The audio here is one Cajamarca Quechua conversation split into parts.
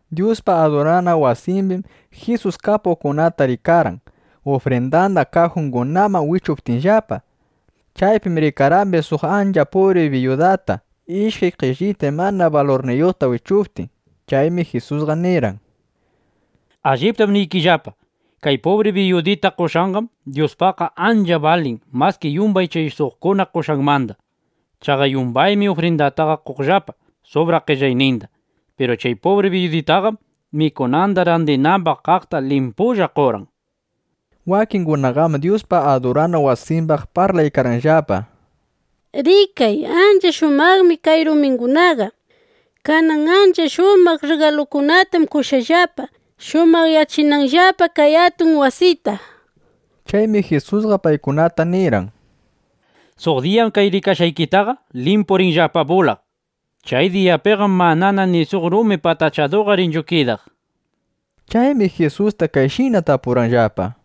Dyuspa adurana wasimbim Jisus kapuqkunata rikarqan, ufrindanda kajungunaman wichuptinllapa. Chaypim rikarqambis suq ancha pubri biyudata, ishkay qellitay mana balurniyuqta wichuptin. Chaymi Jisusqa nirqan: —Alliptam niykillapa, kay pubri biyudita qoshqanqam Dyuspaqqa ancha balin maski yumbay chay suqkuna qoshqanmanda. Chaqa yumbaymi ufrindataqa qonllapa subraq qellayninda. Piru chay pubri biyuditaqam mikunanda randinambaq kaqta limpulla qorqan, nishpa. Wakingunaqam Dyuspa adurana wasimbaq parlaykarqanllapa: —Rikay, ancha shumaqmi kay rumingunaqa. Kanan ancha shumaq rrigalukunatam qoshqallapa, shumaqyachinanllapa kay atun wasita, nishpa. Chaymi Jisusqa paykunata nirqan: —Suq diyam kay rikashqaykitaqa limpu rinllapa bulaq. Chay diyapiqam manana ni suq rumi patachaduqa rinchu kidaq, nishpa. Chaymi Jisusta kayshina tapurqanllapa: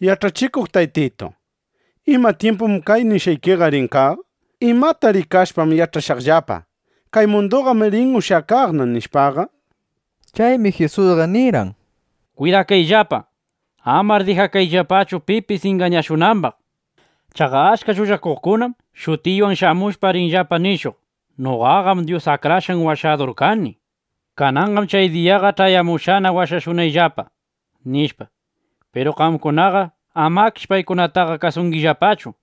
—Yach'achikuq Taytitu, ¿ima tyimpum kay nishqaykiqa rin kaq? ¿Imata rikashpam yach'ashaqllapa: Kay munduqam rin ushyakaqna, nishpaqa? Chaymi Jisusqa nirqan: —Kwidakayllapa. Amar dijakayllapachu pipis ingañashunambaq. Chaqa achka llullakuqkunam shutiywan shamushpa, rinllapa nishuq: “Noqaqam Dyus Akrashqan Washadur kani. Kananqam chay diyaqa ch'ayamushqana washashunayllapa”, nishpa. Piru qamkunaqa amakish paykunataqa kasungillapachu.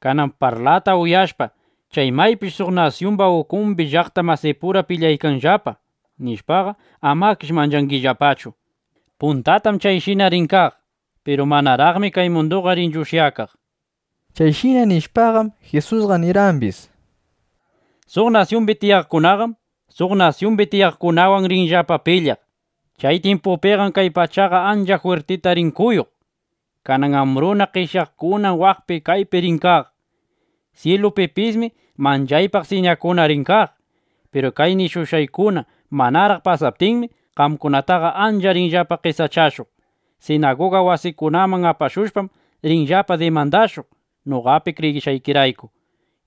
Kanan parlata uyashpa, chay maypish nasyungunapura pilyaykanllapa, chay maypish suq nasyumba ukumbi llaqta masipura pilyaykanllapa, nishpaqa, amakish manchangillapachu. Puntatam chayshina rin kaq, piru manaraqmi kay munduqa rinchu ushyakaq. Chayshina nishpaqam, Jisusqa nirqambis: —Suq nasyumbi tiyaqkunaqam suq nasyumbi tiyaqkunawan rinllapa pilyaq. Chay tyimpupiqam kay pachaqa ancha jwirtita rin kuyuq. Kanan ambruna, qeshyaykunam waqpi kaypi rin kaq. Syilupipismi manchaypaq siñakuna rin kaq. ’Piru kay nishushqaykuna manaraq pasaptinmi, qamkunataqa ancha rinllapa qesachashuq. Sinaguga wasikunaman apashushpam, rinllapa dimandashuq, noqapi kriyishqaykirayku.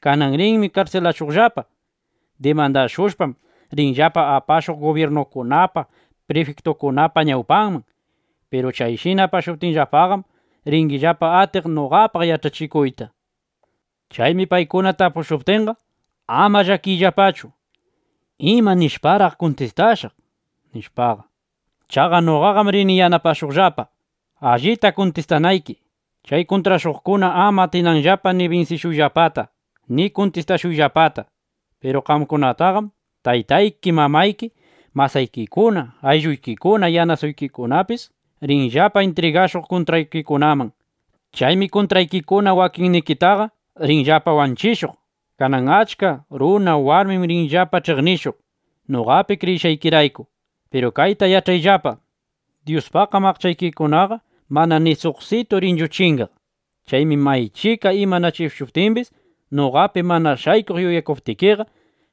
Kanan rinmi karsilashuqllapa. Dimandashushpam, rinllapa apashuq gubyirnukunapa, prifiktukunapa ñawpanman. Piru chayshina apashuptinllapaqam, ringillapa atiq noqapaq yach'achikuyta. Chaymi paykuna tapushuptinqa, ama llakiyllapachu: ¿Ima nishparaq kuntistashaq? nishpaqa. Chaqa noqam rini yanapashuqllapa, allita kuntistanayki, chay kuntrashuqkuna ama atinanllapa ni binsishuyllapata ni kuntistashuyllapata. Piru qamkunataqam taytayki, mamayki, masaykikuna, aylluykikuna, yanasuykikunapis (yanasaykikunapis) rinllapa intrigakushuq kuntraykikunaman. Chaymi kuntraykikuna wakinnikitaqa rinllapa wanchishuq. Kanan achka runa, warmim rinllapa ch'iqnishuq, noqapi kriyishqaykirayku. Piru kayta yach'ayllapa: Dyuspaqqam aqchaykikunaqa mana ni suqsitu rinchu chingaq. Chaymi maychika imanachishuptimbis, noqapi mana shaykuq yuyakuptikiqa,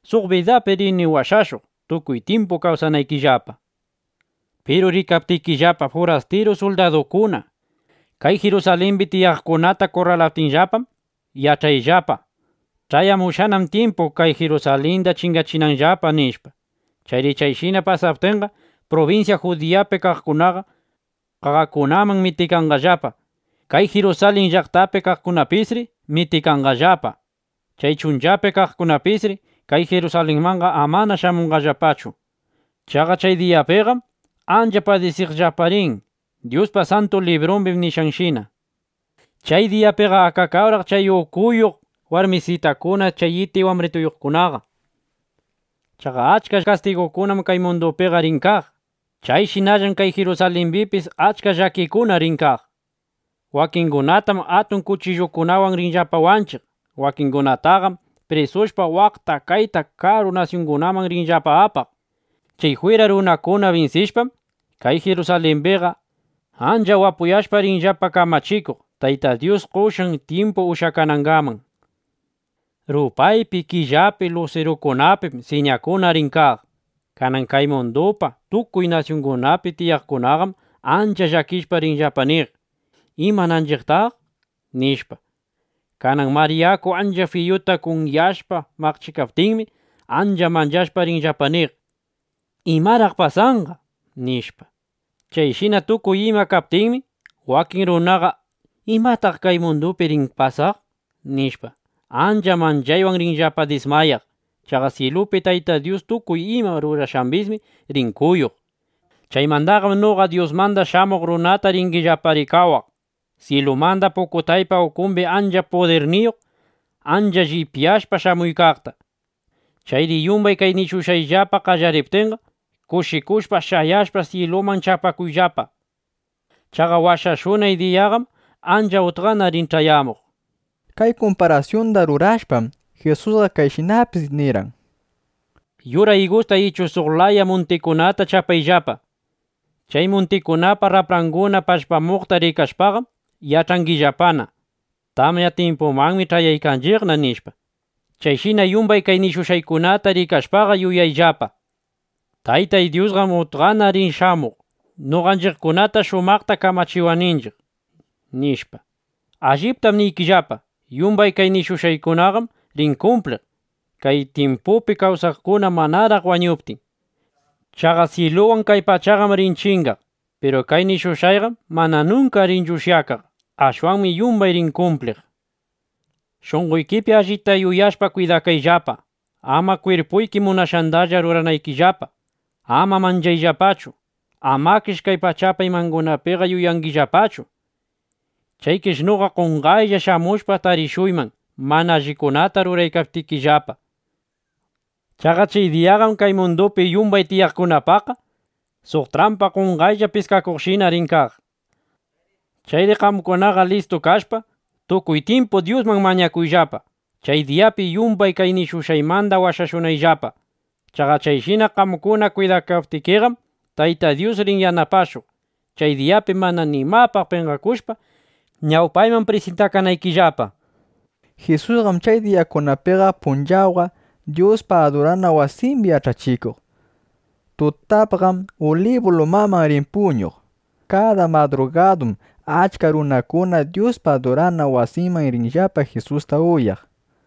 suq bidapi rini washashuq, tukuy tyimpu kawsanaykillapa. ’Piru rikaptikillapa furastiru suldadukuna kay Jirusalimbi tiyaqkunata kurralaptinllapam, yach'ayllapa: Ch'ayamushqanam tyimpu kay Jirusalinda chingachinanllapa, nishpa. Chayri chayshina pasaptinqa, prubinsya Judiyapi kaqkunaqa qaqakunaman mitikanqallapa. Kay Jirusalin llaqtapi kaqkunapisri mitikanqallapa. Chay chunchapi kaqkunapisri kay Jirusalinmanqa amana shamunqallapachu. Chaqa chay diyakunapiqam ancha padisiqllapa rin, Dyuspa Santu Librumbi nishqanshina. ¡Chay diyapiqa akakawraq chay (ukuyuq) pach'ayuq warmisitakuna, chay iti wambrituyuqkunaqa! Chaqa achka kastigukunam kay mundupiqa rin kaq. Chayshinallam kay Jirusalimbipis achka llakikuna rin kaq. Wakingunatam atun kuchillukunawan rinllapa wanchiq. Wakingunataqam prisushpa, waqta, kayta karu nasyungunaman rinllapa apaq. Chay jwira runakuna binsishpam, kay Jirusalimbiqa ancha wapuyashpa rinllapa kamachikuq, Tayta Dyus qoshqan tyimpu ushyakanangaman. ’Rupaypi, killapi, lusirukunapim siñakuna rin kaq. Kanan kay mundupa tukuy nasyunningunapi tiyaqkunaqam ancha llakishpa rinllapa niq: “¿Imananchiqtaq?” nishpa. Kanan mar yaku ancha fiyuta kunyashpa maqchikaptinmi, ancha manchashpa rinllapa niq: “¿Imaraq pasanqa?” nishpa. Chayshina tukuy ima kaptinmi, wakin runaqa: ¿Imataq kay mundupi rin pasaq? nishpa, ancha manchaywan rinllapa dismayaq. Chaqa syilupi Tayta Dyus tukuy ima rurashqambismi rin kuyuq. Chaymandaqam noqa Dyusmanda Shamuq Runata ringillapa rikawaq, syilumanda pukutaypa ukumbi ancha pudirniyuq, ancha llipyashpa shamuykaqta. Chayri yumbay kay nishushqayllapa qallariptinqa, kushikushpa, shayashpa, syiluman chapakuyllapa. Chaqa washashunay diyaqam ancha utqana rin ch'ayamuq. Kay kumparasyunda rurashpam, Jisusqa kayshinapis nirqan: —Yura igusta ichu suq laya muntikunata chapayllapa. Chay muntikunapa rapranguna pallpamuqta rikashpaqam, yach'angillapana: Tamya tyimpumanmi yaykunchiqna, nishpa. Chayshina yumbay kay nishushqaykunata rikashpaqa, yuyayllapa: Tayta Dyusqam utqana rin shamuq, noqanchiqkunata shumaqta kamachiwananchiq, nishpa. ’Alliptam niykillapa, yumbay kay nishushqaykunaqam rin kumpliq kay tyimpupi kawsaqkuna manaraq wañuptin. Chaqa syiluwan kay pachaqam rin chingaq. Piru kay nishushqayqam mana nunka rinchu ushyakaq. Ashwanmi yumbay rin kumpliq. ’Shunqoykipi allita yuyashpa kwidakayllapa, ama kwirpuyki munashqandalla ruranaykillapa. Ama mach'ayllapachu. Amakish kay pachapa imangunapiqa yuyangillapachu. Chaykish noqa qonqaylla shamushpa, tarishuyman mana allikunata ruraykaptikillapa. Chaqa chay diyaqam kay mundupi yumbay tiyaqkunapaqqa suq trampa qonqaylla piskakuqshina rin kaq. Chayri qamkunaqa listu kashpa, tukuy tyimpu Dyusman mañakuyllapa, chay diyapi yumbay kay nishushqaymanda washashunayllapa. Chaqa chayshina qamkuna kwidakaptikiqam, Tayta Dyus rin yanapashuq, chay diyapi mana nimapaq penqakushpa, ñawpayman prisintakanaykillapa, nishpa. Jisusqam chay diyakunapiqa punchawqa Dyuspa adurana wasimbi yach'achikuq. Tutapqam Ulibu lumaman riq puñuq. Kada madrugadum achka runakuna Dyuspa adurana wasinman riqllapa, Jisusta uyaq.